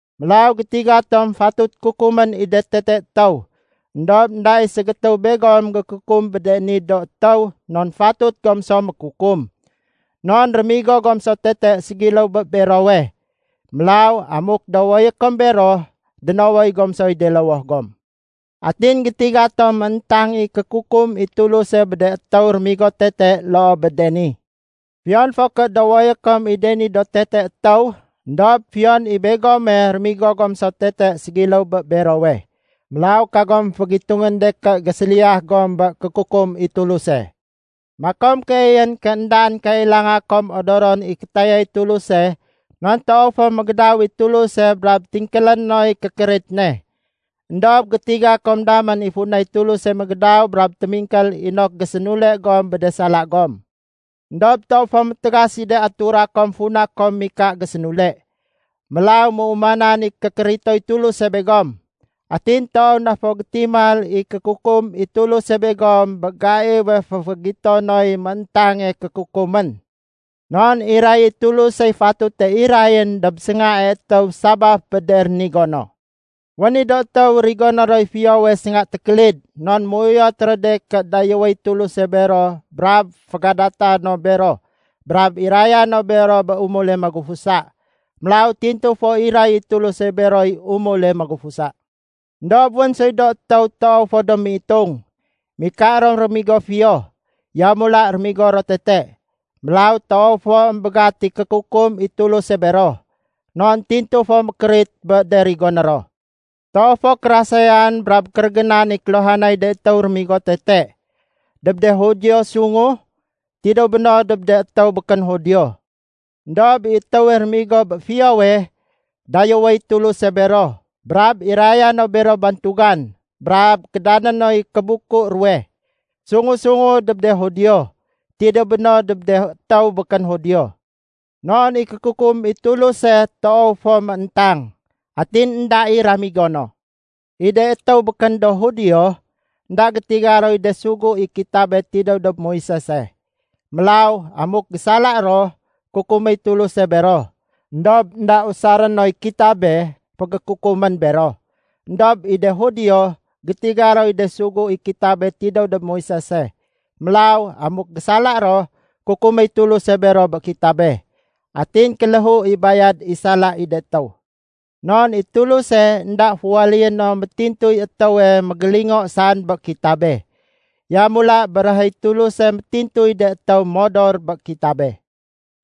Mélaw gétiga tom fatut kukumén i de tete étéw. Endob énda i ségétéw begom gékukum bé de ni do étéw non fatut gom so mékukum. Non rémigo gom so tete ségiléw bé berowe. Mélaw amuk dowoyé kom bero, dénowoy gom soy de lowoh gom. Atin gétiga tom mééntang i kékukum i Tuluse bé de étéw rémigo tete loo bé de ni. Fiyon fo ké dowoyé kom i de ni do tete étéw, éndob fiyon i begome rémigo gom so tete ségiléw bé berowe. Mélaw kagom fégitungén de ké géséliyah gom bé kékukum i Tuluse. Makom keeyén ké éndaén kailanga kom odoron i kétayay Tuluse non toow fo mégédaw i Tuluse brab tingkélé noy kékérit ne. Endob gétiga kom damén i funay Tuluse mégédaw brab témingkél inok gésénule gom bé de sala gom. Endob toow fo métégas i de atura kom funa kom mika gésénule. Mélaw méumanan i kékéritoy Tuluse begom. Atin toow na fo gétimal i kékukum i Tuluse begom bé gaiwe féfégito noy méntange kékukumén. Non iray i Tulusey fatute irayén dob séngae étéw sabaf bé de rénigo no. Wén i do étéw rigoné roy fiyowe sénga tékélid non méuyot ro de ké dayéwéy Tuluse bero brab fégadata no bero brab iraya no bero bé umule magufusa. Mélaw tintu fo iray i Tuluse beroy umule magufusa. Endob wén soy do étéw toow fo do méitung. Mika ro rémigo fiyo, yamula rémigo ro tete. Mélaw toow fo émbégat i kékukum i Tuluse bero, non tintu fo mékérit bé de rigoné ro. Toow fo kérasayan brab kérégénan i kéluhanay de étéw rémigo tete, dob de Judio sungu, tidéw béno dob de étéw békén Judio. Endob i de étéw rémigo bé fiyowe, dayéwéy Tuluse bero brab iraya no bero bantugan brab kédané noy kébuku ruwe. Sungu-sungu dob de Judio, tidéw béno dob de étéw békén do Judio. Non i kékukum i Tuluse toow fo mééntang, atin énda i ramigo no. I de étéw békén do Judio, énda gétiga roy de sugu i kitabe tidéw dob Moisese. Mélaw amuk gésala ro, kukuméy Tuluse bero, éndob énda usaré noy kitabe fégékukumén bero. Endob i de Judio, gétiga roy de sugu i kitabe tidéw dob Moisese. Mélaw amuk gésala ro, kukuméy Tuluse bero bé kitabe. Atin i bayad i sala i de étéw kéléhu. Non i Tuluse énda féwaléyé no métintuy étéwe mégélingo saén bé kitabe. Yamula béréhéy Tuluse métintuy de étéw modor bé kitabe.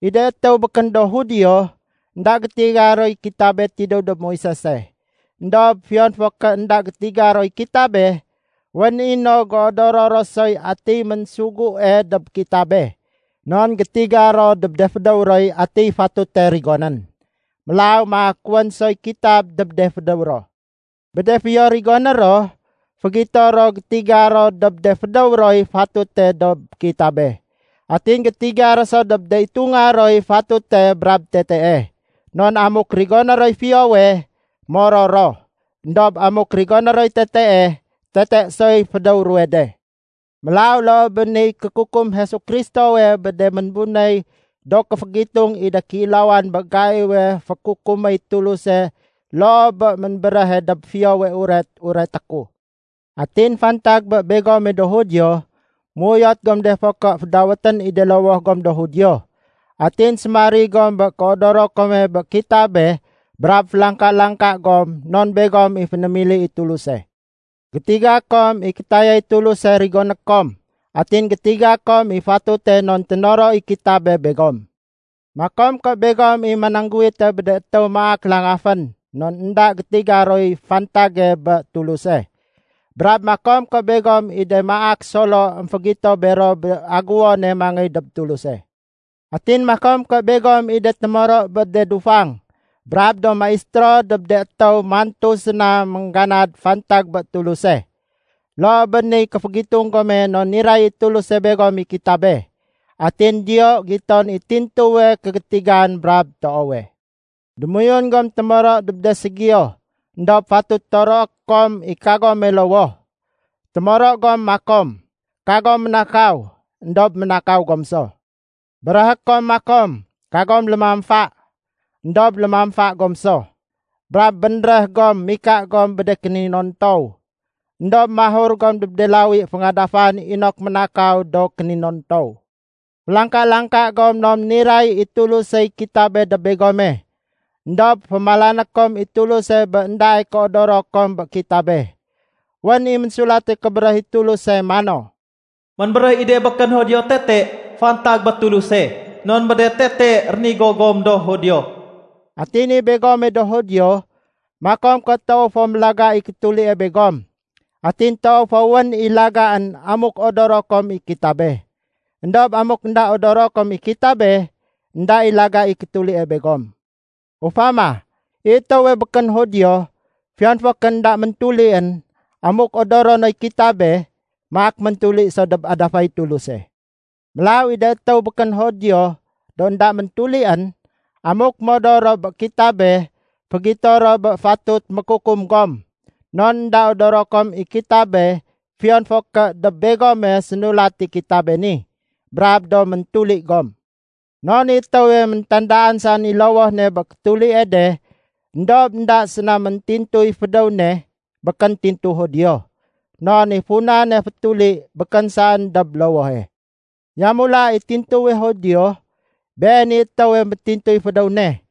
I de étéw békén do Judio, énda gétiga roy kitabe tidéw dob Moisese. Endob fiyon fo ké énda gétiga roy kitabe, wén i no géodoro ro soy atiy ménsugue dob kitabe. Non gétiga ro dob de fédéw roy atiy fatute rigonén. Mélaw maak wén soy kitab dob de fédéw ro. Bé de fiyo rigoné ro, fégito ro gétiga ro dob de fédéw roy fatute dob kitabe. Atin gétiga ro so dob de itunga roy fatute brab tetee. Non amuk rigoné roy fiyowe, moror ro. Endob amuk rigoné roy tetee, tete soy fédéw ruwe de. Mélaw loo bé niy kékukum Jesu Kristowe bé de ménbunéy do kéfégitung i de kéilawan bé gaiwe fékukuméy Tuluse loo bé ménbéréhe dob Fiyowe Uret ureté ku. Atin fantag bé begome do Judio. Méuyot gom de fo ké fédawét gom i de lowoh gom do “Judio”. Atin sémarig gom bé kéodoro kome bé kitabe brab félangka-langka gom non begom i fénémili i Tuluse. Gétiga kom i kétayay Tuluse rigoné kom atin gétiga kom i fatute non ténoro i kitabe begom. Makom ké begom i manangguwite bé de étéw maak langafén non énda gétiga roy fantage bé Tuluse. Brab makom ké begom i do maak solo émfégito bero bé agéwone mangéy dob Tuluse. Atin makom ké begom i do témoro bé de dufang, brab do maistéro dob de étéw mantu séna méngganad fantag bé Tuluse. Loo bé niy kéfégitung gome non niray i Tuluse begom i kitabe, atin diyo giton i tintuwe kégétigan brab toowe. Démoyun gom témoro dob de ségiyo, éndob fatut toroé kom i kagome lowoh. Témoro gom makom, “Kagom ménakaw”, éndob ménakaw gom so. Béréhé kom makom, “Kagom lémamfa”. Endob lémamfa gom so. Brab bénréh gom mika gom bé de kéninontow, éndob mahur gom dob de lawi féngadafan inok ménakaw do kéninontow. Félangka-langka gom non niray i Tulusey kitabe dob begome. Endob fémalané kom i Tuluse bé éndae kéodoro kom bé kitabe. Wén i Ménsulate Kébéréh i Tuluse mano, “Ménbéréh i de békén Judio tete fantag bé Tuluse non bé de tete rénigo gom do Judio.” Atin i begome do Judio, makom ké toow fo mélaga i kétulie begom. Atin toow, wén i lagaén amuk odoro kom i kitabe. Endob amuk énda odoro kom i kitabe, énda i laga i kétulie begom. Ufama, i étéwe békén Judio, fiyon fo ké énda méntulién, amuk odoro noy kitabe, maak méntuli so dob adafay Tuluse. Mélaw i de étéw békén Judio do énda méntulién, amuk modor ro bé kitabe, fégito ro bé fatut mékukum gom. Non énda odoro kom i kitabe fiyon fo ké dob begome sénulat i kitabe ni, brab do méntuli gom. Non i étéwe métandaan saén i lowoh ne bé kétulie de éndob énda séna méntintuy fédéw ne, békén tintu Judio. Non i funane fétuli békén saén dob lowohe. Yamula i tintuwe Judio, been i étéwe métintuy fédéw ne.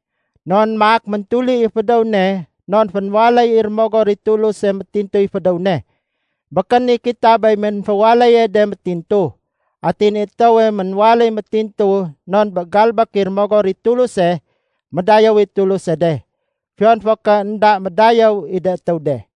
Non maak méntuli i fédéw ne non fénwaléy i Rémogor i Tuluse métintuy fédéw ne. Békén i kitabey ménféwaléye de méntintu. Atin i étéwe ménwaléy méntintu non bé galbék i Rémogor i Tuluse, médayéw i Tuluse de, fiyon fo ké énda médayéw i de étéw de.